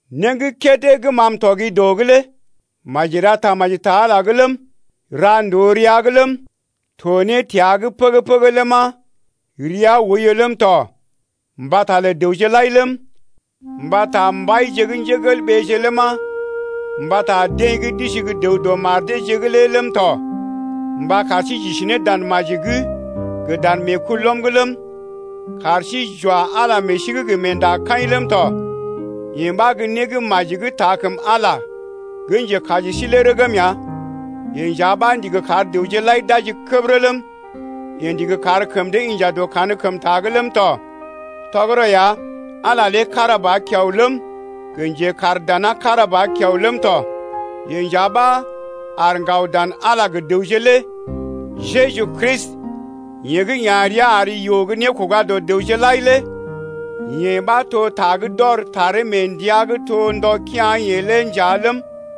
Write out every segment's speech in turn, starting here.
Né gə́ kédé gə́ ma m’tɔgi dɔ’g lé maji ra tamaji ta Ala’g ləm, ra ndòo rəa’g ləm, to ne təa’g pəgə-pəgə ləma, rəa oiyo ləm tɔ mbata lə dəwje lai ləm, mbata mbaije ləma, mbata deḛ gə́ d’isi gə́ dəw dɔ mar deeje’g lé ləm tɔ mba kar sí j’isi ne dan maji’g gə dan meekulɔm’g ləm, kar sí j’wa Ala meḛ sí’g gə meendakaḭ ləm tɔ Yee ɓa gə́ né gə́ maji gə́ taa kəm Ala gə́ njekaji sí lé rəgm ya. Yeḛ nja ɓa ndigi kar dəwje lai d’aji kəbərə ləm, yeḛ ndigi kar kəm dee inja dɔ kankəmta’g ləm tɔ. Tɔgərɔ ya, Ala lé kára ba kiao ləm, gə njekaar dana kára ba kiao ləm tɔ, yeḛ nja ɓa aar ŋgaw dan Ala lé gə dəwje lé, Jeju Kristi, yeḛ gə́ ya̰ rəa ar yoo gə́ nékoga dɔ dəwje lai lé. Yee ɓa to ta gə́ d’ɔr taree mee ndəa gə́ to ndɔ kea̰-yeḛ lé nja ləm,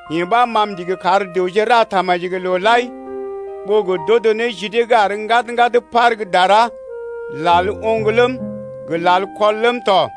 Yee ɓa, ma m’ndigi kar dəwje ra tamaji gə loo lai, ɓó gə d’odo ne ji dee gə́ àr ŋgad-ŋgad par gə́ dara, lal oŋg ləm, gə lal kɔl ləm tɔ.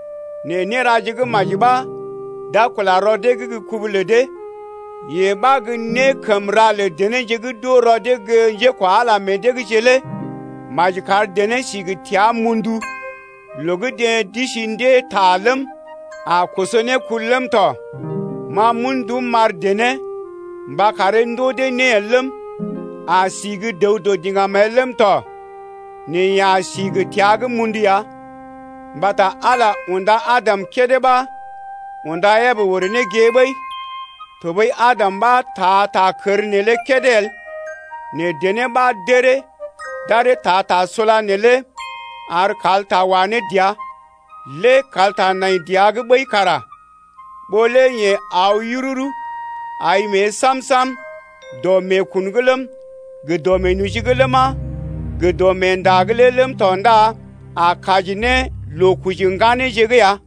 Nɛ néraje gə́ maji ɓa d’a kula rɔ dee’g gə́ kubu lə dee, yee ɓa gə́ né kəm ra lə denéje gə́ d’oo rɔ dee gə́ njékwa Ala meḛ deeje’g lé ya. Maji kar dené sí gə təa mundu loo gə́ deḛ d’isi ndée ta ləm, a koso ne kul ləm tɔ. Ma m’un ndum m’ar dené mba karee ndoo dee né el ləm, a si gə́ dəw dɔ diŋgam el ləm tɔ, nɛ yeḛ a si gə təa gə́ mundu ya. Mbata Ala unda Adam kédé ɓa unda Ebə orè ne gée ɓəi. Tɔɓəi Adam ɓa taa ta kər neelé kédé el nɛ dené ɓa d’əree d’aree taa ta sula neelé ar kalta wa ne dəa. Lé kalta nai dəa’g ɓəi kara ɓó lé yeḛ aw yururu ai mée sam-sam dɔ meekun’g ləm, gə dɔ meenoji’g ləma, gə dɔ meenda’g lé ləm tɔ ndá a kaji ne loo koji ŋganeeje’g ya.